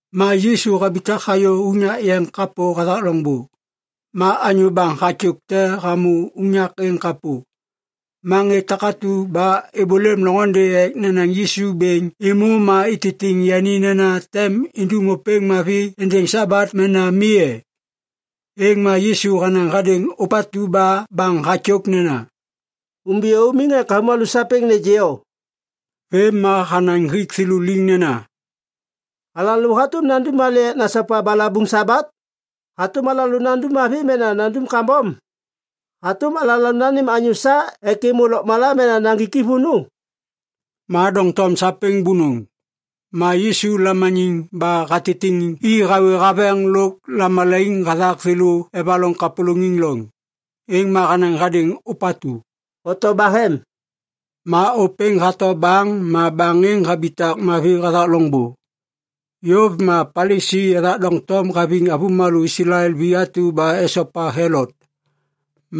Ma Yisu habitak hayô unyak yeŋ kapô hathak loŋbô. Ma anyô baŋ hatyôk te hamô unyak êŋ kapô. Ma ŋê takatu ba êbôlêm loŋôndê ek nenaŋ Yisu bêŋ êmô ma ititiŋ yani nena tem indum ôpêŋ mavi êndêŋ Sabat mena mi e? Êŋ ma Yisu hanaŋ hadêŋ ôpatu ba baŋ hatyôk nena, “Umbiyô umiŋ ek avômalô sapêŋ nêgê o.” Vêm ma hanaŋ hik thêlô liŋ nena, “Alalô hatôm nandum malê ek nasopa balabuŋ Sabat? Hatôm alalô nandum mavi mena nandum kambom? Hatôm alalô nanêm anyô sa ek êmô lôkmala mena naŋgik i vônô?” Ma doŋtom sapêŋ bônôŋ. Ma Yisu lamaniŋ ba hatitiŋ i hawê haveŋ lôk lamalaiŋ hathak thêlô evaloŋ kapôlôŋiŋ loŋ. Êŋ ma hanaŋ hadêŋ ôpatu, “Oto bahem.” Ma ôpêŋ hato baŋ ma baŋ êŋ habitak mavi hathak loŋbô. Yôv ma Palisi ethak doŋtom haviŋ avômalô Islael vi atu ba esopa Helot.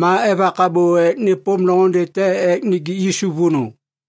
Ma evak abô ek nêpôm loŋôndê te ek nijik Yisu vônô.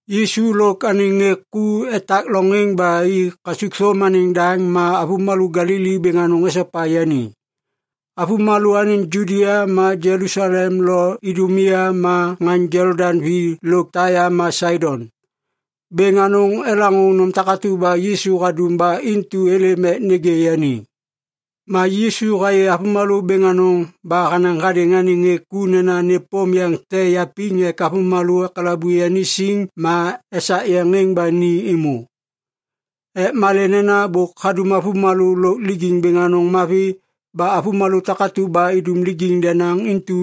Yisu lôk anêŋ ŋê ku etak loŋ êŋ ba i kasukthôm anêŋ daŋ ma avômalô Galili bêŋ anôŋ esopa yani. Avômalô anêŋ Judia ma Jelusalem lo Idumia ma ŋaŋ Jolodaŋ vi lôk Taia ma Saidon, bêŋ anôŋ elaŋô nôm takatu ba Yisu hadum ba intu êlêm ek nêgê yani. Ma Yisu hayê avômalô bêŋ anôŋ ba hanaŋ hadêŋ anêŋ ŋê ku nena nêpôm yeŋ te yapiŋ ek avômalô ekalabu yani siŋ ma esak yeŋ êŋ ba ni êmô. Ek malê nena bôk hadum avômalô lôk lijiŋ bêŋ anôŋ mavi ba avômalô takatu ba idum lijiŋ denaŋ intu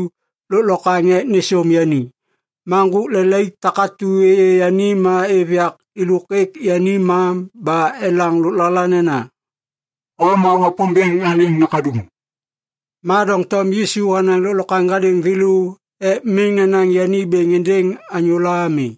lôklokwaŋ ek nêsôm yani. Ma ŋgôk lelaik takatu êyê yani ma êv yak êlôk êk yani ma ba elaŋ lôklala nena, “O ma Wapômbêŋ anêŋ Nakaduŋ.” Ma doŋtom Yisu hanaŋ lôklokwaŋ hadêŋ thêlô ek miŋ nenaŋ yani bêŋ êndêŋ anyôla ami.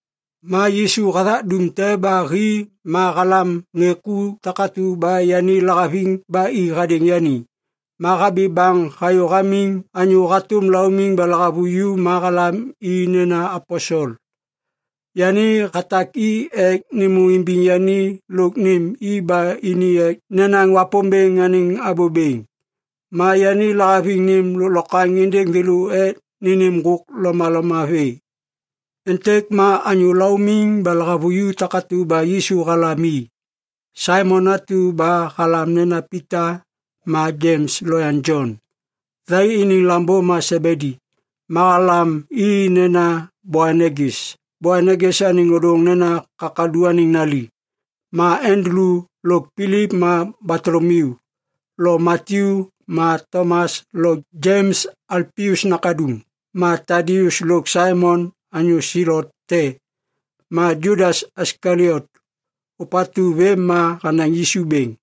Ma Yisu hathak dum te ba hi ma halam ŋê takatu ba yani lahaviŋ ba i hadêŋ yani. Ma habi baŋ hayô hamiŋ anyô hatôm laumiŋ ba lahavuju ma halam i nena aposel. Yani hatak i ek nêmô imbiŋ yani lôk nêm i ba ini ek nenaŋ Wapômbêŋ anêŋ abô bêŋ. Ma yani lahaviŋ nêm lôklokwaŋ êndêŋ thêlô ek nênêm ŋgôk lomaloma vê. Êntêk ma anyô laumiŋ ba lahavuju takatu ba Yisu halam i. Saimon atu ba halam nena Pita ma Jems lo yaŋ Jon, thai iniŋ lambô ma Sebedi. Ma halam i nena Boanegis. Boanegis anêŋ ôdôŋ nena Kakalu anêŋ Nali. Ma Andulu lôk Pilip ma Batolomiu lo Matyu ma Tomas lo Jems Alpius nakaduŋ ma Tadius lôk Saimon anyô Selot te ma Judas Iskaliot, ôpatu vêm ma hanaŋ Yisu bêŋ.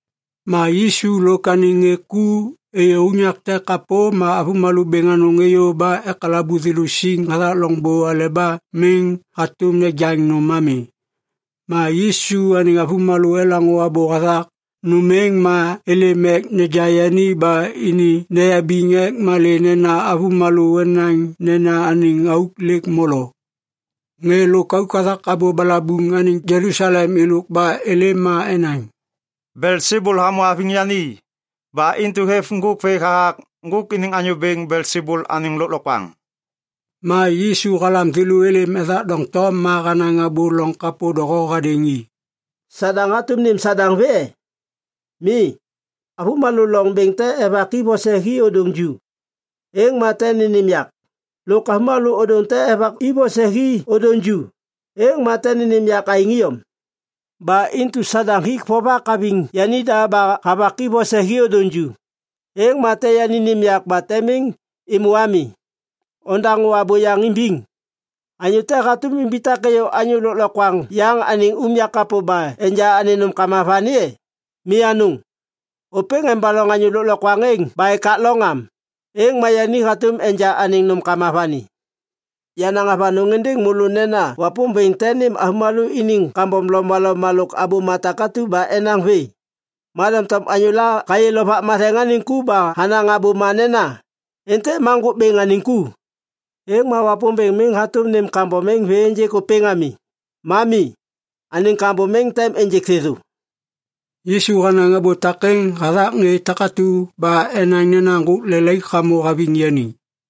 Ma Yisu lôk anêŋ ŋê ku êyô unyak te kapô ma avômalô bêŋ anôŋ êyô ba ekalabu thêlô siŋ hathak loŋbô aleba miŋ hatôm nejaŋ nôm ami. Ma Yisu anêŋ avômalô elaŋô abô hathak nôm êŋ ma êlêm ek neja yani ba ini neyabiŋ ek malê nena avômalô enaŋ nena anêŋ auk lêk molo. Ŋê lôkauk hathak abô balabuŋ anêŋ Jelusalem êlôk ba êlêm ma enaŋ, “Belsebul hamô haviŋ yani! Ba intu hêv ŋgôk vê hathak ŋgôk iniŋ anyô bêŋ Belsebul anêŋ lôklokwaŋ.” Ma Yisu halam thêlô êlêm ethak doŋtom ma hanaŋ abô loŋ kapô doho hadêŋ i. “Sadaŋ hatôm nêm Sadaŋ vê e? Mi, avômalô loŋ bêŋ te evaki vose hi ôdôŋ ju, êŋ ma tem nênêm yak. Lôk avômalô ôdôŋ te evaki vose hi ôdôŋ ju, êŋ ma tem nênêm yak aêŋ iyom. Ba intu Sadaŋ hik vovak haviŋ yanida ba havaki vose hi ôdôŋ ju, êŋ ma tem yani nêm yak ba tem miŋ êmô ami. Odaŋô abô yaŋ imbiŋ. Anyô te hatôm imbitak êyô anyô lôklokwaŋ yaŋ anêŋ unyak kapô ba enja anêŋ nômkama vani e? Mi anôŋ! Ôpêŋ embaloŋ anyô lôklokwaŋ êŋ ba ekak loŋ am, êŋ ma yani hatôm enja anêŋ nômkama vani. Yanaŋ avanôŋ êndêŋ môlô nena Wapômbêŋ tem nêm avômalô iniŋ kambom lomaloma lôk abôma takatu ba enaŋ vê. Ma doŋtom anyôla hayê Lovak Matheŋ anêŋ ku ba hanaŋ abôma nena, ‘Êntêk ma Ŋgôk Bêŋ anêŋ ku’, êŋ ma Wapômbêŋ miŋ hatôm nêm kambom êŋ vê ênjêk ôpêŋ ami. Ma mi. Anêŋ kambom êŋ tem ênjêk thêthô.” Yisu hanaŋ abô takêŋ hathak ŋê takatu ba enaŋ nena ŋgôk lelaik hamô haviŋ yani.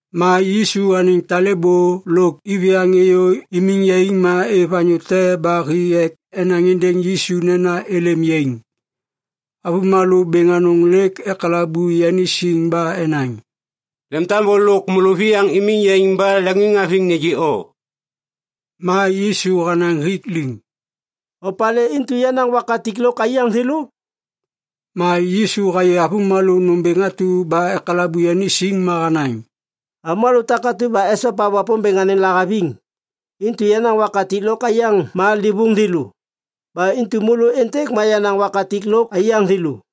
Ma Yisu anêŋ talêbô lôk iviyaŋ êyô imiŋ yaiŋ ma êv anyô te ba hi ek enaŋ êndêŋ Yisu nena êlêm yaiŋ. Avômalô bêŋ anôŋ lêk ekalabu yani siŋ ba enaŋ, “Lemtambô lôk môlôviyaŋ imiŋ yaiŋ ba leŋiŋhaviŋ nêgê o.” Ma Yisu hanaŋ hik liŋ, “Opalê intu yenaŋ wakatik lôk aiyaŋ thêlô?” Ma Yisu hayê avômalô nômbêŋ atu ba ekalabu yani siŋ ma hanaŋ, “Avômalô takatu ba esopa Wapômbêŋ anêŋ lahaviŋ, intu yenaŋ wakatik lôk aiyaŋ ma livôŋ thêlô. Ba intu môlô êntêk ma yenaŋ wakatik lôk aiyaŋ thêlô.”